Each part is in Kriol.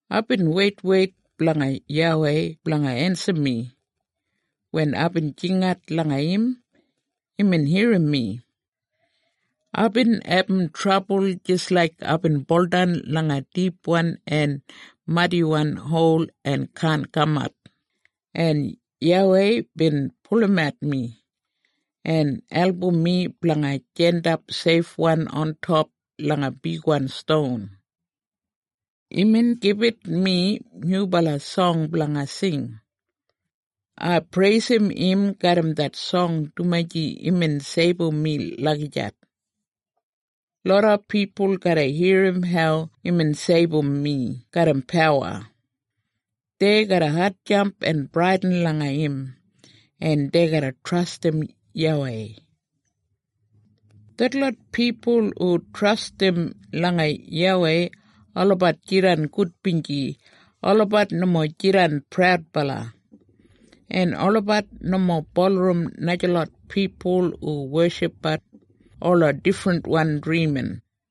Aibin weitweit blanga YAWEI blanga ensim mi. Wen aibin jingat langa im, imbin irrim mi. Aibin abum trabul jis laik aibin buldan langa dipwan en madiwan hol en kaan kamat, en YAWEI bin pulumat mi, en album mi blanga jandap seifwan ontop langa bigwan ston. Imbin gibit mi nyubala song blanga sing. Ai preisim im garram det song dumaji imbin seibum mi lagijat. Loda pipul garra irrim hau imbin seibum mi garram pawa. Dei garra hatjamp en bradin langa im, en dei garra trastim YAWEI. Detlot pipul hu trastim langa YAWEI, olabat jidan gudbinji. Olabat nomo jidan praudbala, en olabat nomo bulurrum najalot pipul hu weshipbat ola difrinwan drimin.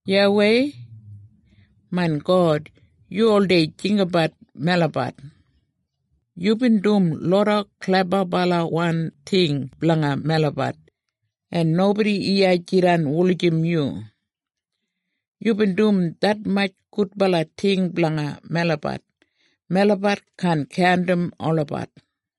YAWEI, main God, yu oldei jinggabat melabat. Yubin dum loda klebabalawan ting blanga melabat, en nobodi iya jidan wulijim yu! Yubin dum detmatj gudbala ting blanga melabat, melabat kaan kaundim olabat!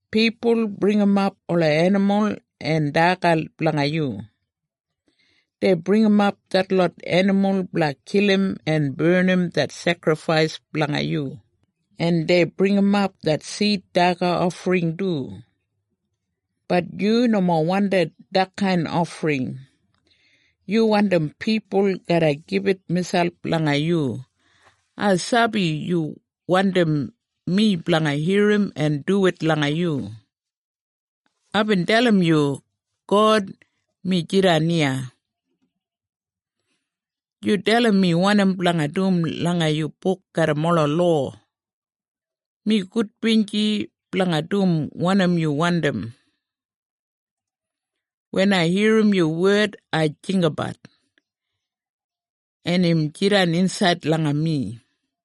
Pipul bringimap ola enimul en daga blanga yu. Dei bringimap detlot enimul blanga kilim en barnim det sekrifais blanga yu, en dei bringimap det sid daga ofring du. Bat yu nomo wandim detkain ofring. Yu wandim pipul garra gibit miselp langa yu. Ai sabi yu wandim mi blanga irrim en duwit langa yu. Aibin dalim yu, “God, mi jidan iya. Yu dalim mi wanim blanga dum langa yu buk garram ola lowa. Mi gudbinji blanga dum wanim yu wandim. Wen ai irrim yu wed ai jinggabat, en im jidan insaid langa mi.”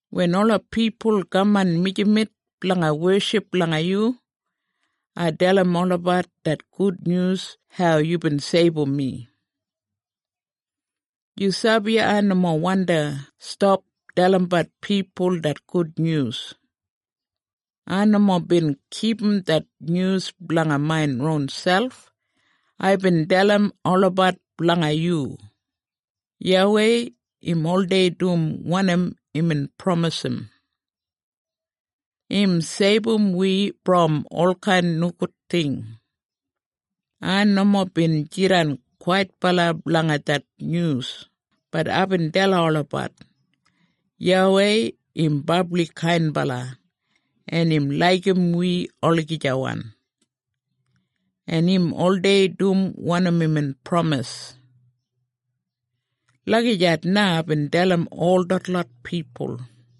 Wen ola pipul kaman mijamet blanga weship langa yu, ai dalim olabat det gudnyus hau yubin seibum mi. Yu sabi ai nomo wandi stap dalimbat pipul det gudnyus. Ai nomo bin kipum det nyus blanga main ronselp. Aibin dalim olabat blanga yu, “YAWEI, im oldei dum wanim imbin pramisim. Im seibum wi brom olkain nogud ting.” Ai nomo bin jidan kwaitbala blanga det nyus, bat aibin dalim olabat, “YAWEI, im brabli kainbala, en im laigim wi olagijawan, en im oldei dum wanim imbin pramis.” Lagijat na aibin dalim ol detlot pipul.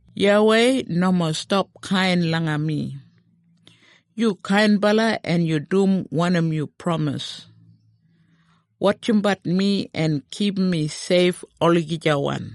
YAWEI, nomo stap kain langa mi. Yu kainbala en yu dum wanim yu pramis. Wotjimbat mi en kipum mi seif olagijawan.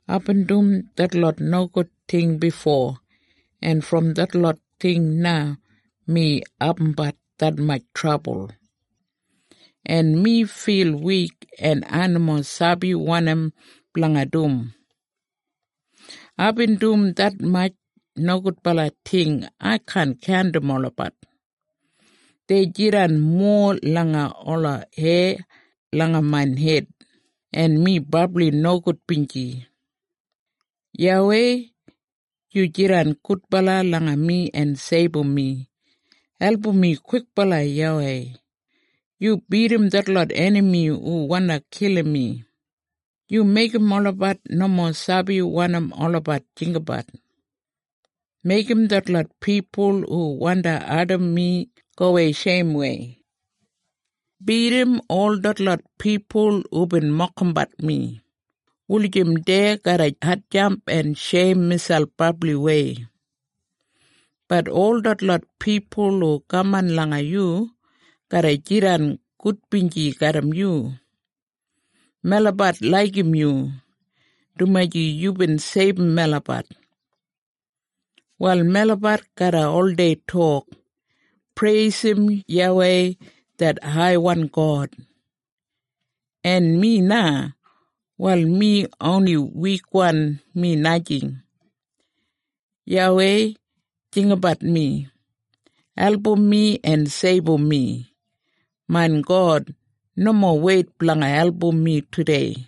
Aibin dum detlot nogud ting bifo, en brom detlot ting na mi abumbat detmatj trabul, en mi fil wik, en ai nomo sabi wanim blanga dum. Aibin dum detmatj nogudbala ting ai kaan kaundim olabat. Dei jidan mowa langa ola heya langa main hed, en mi brabli nogudbinji. YAWEI, yu jidan gudbala langa mi en seibum mi! Album mi kwikbala, YAWEI! Yu bidim detlot enami hu wandi kilim mi. Yu meigim olabat nomo sabi wanim olabat jinggabat. Meigim detlot pipul hu wandi ardim mi gowei sheimwei. Bidim ol detlot pipul hubin mokimbat mi, wulijim dei garra hatjamp en sheim miselp brabliwei. Bat ol detlot pipul hu kaman langa yu, garra jidan gudbinji garram yu. Melabat laigim yu, dumaji yubin seibum melabat. Wal melabat garra oldei tok, “Preisim YAWEI det haiwan God!” En mi na, wal mi oni wikwan, mi najing! YAWEI jinggabat mi. Album mi en seibum mi. Main God, nomo weit blanga album mi tudei.